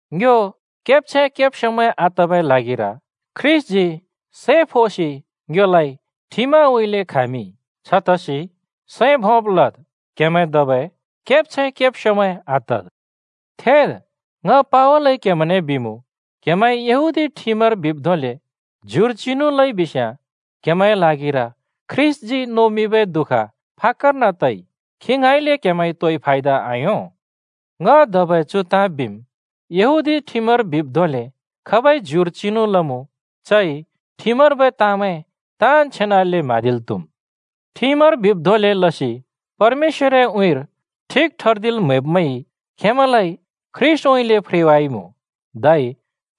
ङ्यो केब्छैं-केब्स्‍योमैं आतबै ल्हागिर ख्रीष्‍टजी सै फोसि ङ्योलाइ ठिमउँइँले खामिंइ। छतसि सैं भोंब् लद्। क्‍हेमैं धबै केब्छैं-केब्स्‍योमैं आतद्! थेद्, ङ पावलइ क्हेमैंने बिमुँ: क्‍हेमैंइ यहूदी ठिमर बिब् धोंले ज्युर चिनु लइ बिस्‍याँ क्‍हेमैंए ल्हागिर ख्रीष्‍टजी नोमिंबै दुःख फाक्‍कर्न तइ। खी ङाँइँले क्हेमैंइ तोइ फायदा आयों। ङ धबै चु ताँ बिम्: यहूदी ठिमर बिब् धोंले खाबइ ज्युर चिनु लमुँ, चइ ठिमर्बै ताँमैं ताँन् छेनाले म्‍हाँदिल् त्‍हुम्। ठिमर बिब् धोंले लसि परमेश्‍वरए उँइँर ठिक ठर्दिल् म्‍हैब्मैंइ खेंमैंलाइ ख्रीष्‍टउँइँले फ्रेवाइमुँ, धै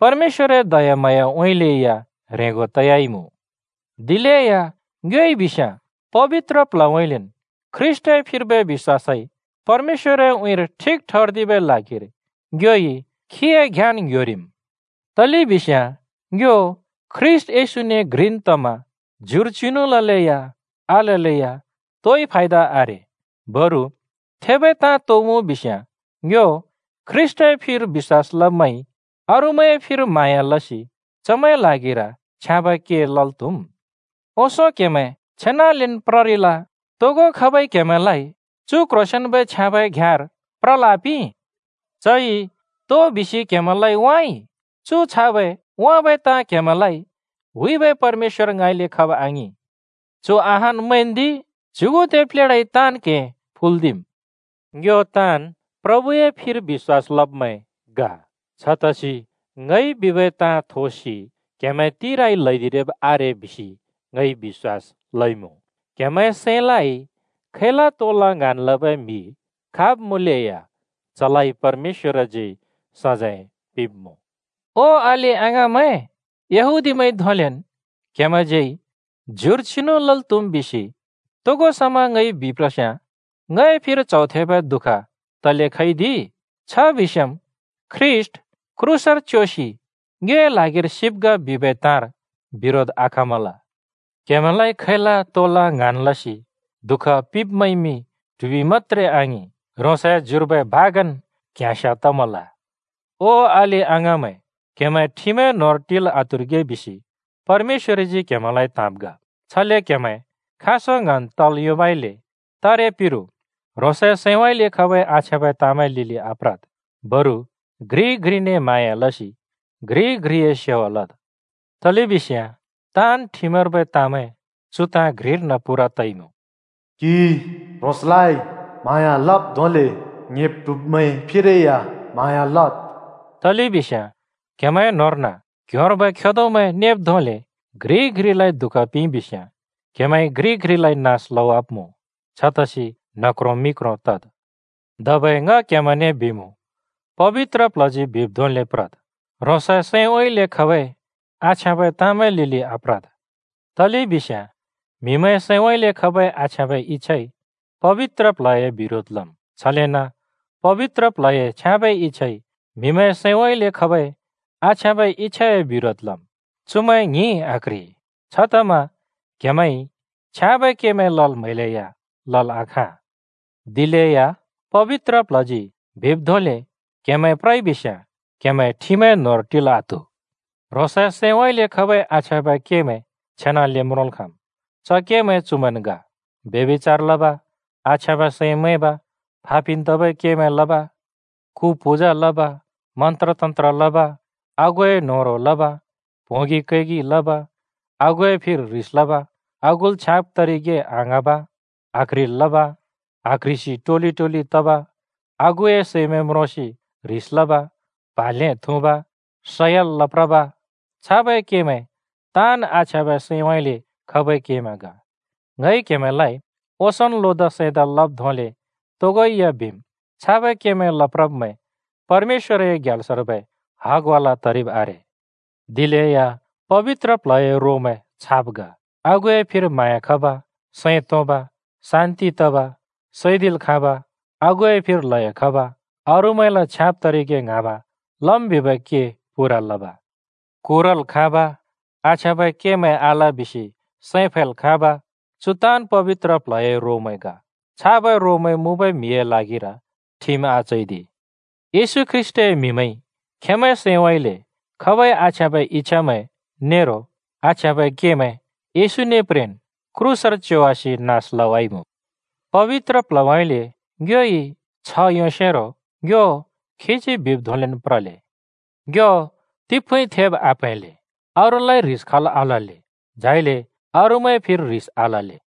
परमेश्‍वरए दयाम्हाँयाउँइँले या ह्रेंगो तयाइमुँ। दिलेया ङ्योइ बिस्याँ पबित्र प्ल्हउँइँलेन् ख्रीष्‍टए फिर्बै बिश्‍वासइ परमेश्‍वरए उँइँर ठिक ठर्दिबै ल्हागिर ङ्योइ खीए घ्याँन् ङ्ह्‍योरिम्। तलेबिस्याँ ङ्यो ख्रीष्‍ट येशूने घ्रिन् तमा ज्युर चिनु ललेया आललेया तोइ फायदा आरे। बरु थेबै ताँ तो मुँ बिस्‍याँ, ङ्यो ख्रीष्‍टए फिर बिश्‍वास लब्मैंइ अरूमैंए फिर म्हाँया लसि चमैंए ल्हागिर छ्याँबै के लल् त्‍हुम्। ओंसों क्‍हेमैं छेनालेन् प्ररिल। तोगो खाबइ क्‍हेमैंलाइ चु क्ह्रोंसेंन्बै छ्याँबै घ्‍याँर प्रल् आपिं? चइ तो बिसि क्‍हेमैंलाइ वाँइ? चु छाबै वाँबै ताँ क्‍हेमैंलाइ हुइबै परमेश्‍वर ङाँइँले खब आङिं। चु अहान् मैंन्दि, “च्युगुदे प्लेढाइ ताँन् क्हें फुल्दिम्।” ङ्यो ताँन् प्रभुए फिर बिश्‍वास लब्मैं ग। छतसि ङइ बिबै ताँ थोसि क्हेमैं तिराइ ल्हैदिरिब् आरे बिसि ङइ बिश्‍वास लइमुँ। क्‍हेमैंए सैंलाइ खैला तोला ङ्हाँन् लबै म्हि, खाब मुँलेया, चलाइ परमेश्‍वरजी सजैं पिंब्‍मुँ। ओ अलि-अङाँमैं, “यहूदीमैंइ धोंलेन् क्हेमैंज्यै ज्युर चिनु लल् त्‍हुम्” बिसि तोगो समा ङइ बिप्रस्याँ ङए फिर च्हौ थेबै दुःख तले खइदि? छ बिस्याँम् “ख्रीष्‍ट क्रूसर च्योसि ङ्योए ल्हागिर सिब् ग” बिबै ताँर बिरोध आखमल। क्‍हेमैंलाइ खैला तोला ङ्हाँन् लसि दुःख पिंब्मैंइमि ट्हुबि मत्‍त्रे आङिं, ह्रोंसए ज्युर्बै भागन् क्‍याँस्याँ तमल। ओ अलि-अङाँमैं, क्‍हेमैं ठिमए न्होंर टिल् आत्हुरिगे बिसि परमेश्‍वरजी क्‍हेमैंलाइ त्‍हाँब् ग। छले क्हेमैं खाँसो ङ्हाँन् तल् योंबइले तारे पिरु ह्रोंसए सैंउँइँले खबै आछ्याँबै ताँमैंए लिलि आप्रद्, बरु घ्रिइ घ्रिने म्हाँया लसि घ्रिइ घ्रिए सेवा लद्। तलेबिस्याँ ताँन् ठिमर्बै ताँमैं चु ताँ घ्रिर्न पूरा तइमुँ: “क्हिइ ह्रोंसलाइ म्हाँया लब् धोंले ङ्‍हेब् ट्हुब्मैंए फिरै या म्हाँया लद्।” तलेबिस्याँ क्‍हेमैंए न्होंर्न क्ह्‍योंर्बै खेदोमैं नेब् धोंले घ्रिइ घ्रिलाइ दुःख पिंइ बिस्याँ क्‍हेमैंइ घ्रिइ घ्रिलाइ नास लवाब्‍मुँ। छतसि न्ह क्रों मि क्रों तद्। धबै ङ क्हेमैंने बिमुँ: पबित्र प्ल्हजी बिब् धोंले प्रद्, ह्रोंसए सैंउँइँले खबै आछ्याँबै ताँमैंए लिलि आप्रद्। तलेबिस्याँ म्‍हिमैंए सैंउँइँले खबै आछ्याँबै इच्‍छाइ पबित्र प्ल्हए बिरोध लम्, छलेन पबित्र प्ल्हए छ्याँबै इच्‍छाइ म्‍हिमैंए सैंउँइँले खबै आछ्याँबै इच्‍छाए बिरोध लम्। चुमैं ङ्हिं आक्‍ह्रि। छतमा क्‍हेमैंइ छ्याँबै केमैं लल् म्हैलेया लल् आखाँ। दिलेया पबित्र प्ल्हजी बिब् धोंले क्‍हेमैं प्रइ बिस्याँ क्‍हेमैं ठिमए न्होंर टिल् आत्‍हु। ह्रोंसए सैंउँइँले खबै आछ्याँबै केमैं छेनाले म्रोंल् खाँम्। च केमैं चुमैंन् ग: ब्यभिचार लब, आछ्याँबै सैं मैंब, फापिन् तबै केमैं लब, कु पूजा लब, मन्‍त्र-तन्‍त्र लब, आगुए न्होह्रों लब, प्होंगि कैगि लब, आगुए फिर ह्रिस लब, आगुल छ्याँब तरिगे आङ्हाँब, आक्ह्रिल् लब, आक्ह्रिसि टोलि-टोलि तब, आगुए सैमैं म्रोंसि ह्रिस लब, प्हा ल्‍हें थुँब, सयल लप्रब, छाबै केमैं ताँन् आछ्याँबै सैंउँइँले खबै केमैं ग। ङइ क्‍हेमैंलाइ ओंसोंन् लोदा सैंदा लब् धोंले तोगो या बिम्: छाबै केमैं लप्रब्मैं, परमेश्‍वरए ग्याल्सर्बै हगवाला तरिब् आरे। दिलेया पबित्र प्ल्हए रोमैं छाब् ग: आगुए फिर म्हाँया खब, सैं तोंब, शान्ति तब, सैदिल् खाँब आगुए फिर ल्हयो खब, अरूमैंल छ्याँब तरिगे ङ्हाँब, लम् बिबै के पूरा लब, कुरल् खाँब, आछ्याँबै केमैं आल बिसि सैं फैल् खाँब। चु ताँन् पबित्र प्ल्हए रोमैं ग। छाबै रोमैं मुँबै म्हिमैंए ल्हागिर ठिम आचैदि। येशू ख्रीष्‍टए म्हिमैंइ खेंमैंए सैंउँइँले खबै आछ्याँबै इच्छामैं नेरो आछ्याँबै केमैं येशूने प्रेन् क्रूसर च्योवासि नास लवाइमु। पबित्र प्ल्हउँइँले ङ्योइ छ्ह योंसेरो ङ्यो खीजी बिब् धोंलेन् प्रले। ङ्यो तिफुँइ थेब् आप्‍हैंले, अरूलाइ ह्रिस खल् आलले, झाइले अरूमैंए फिर ह्रिस आलले।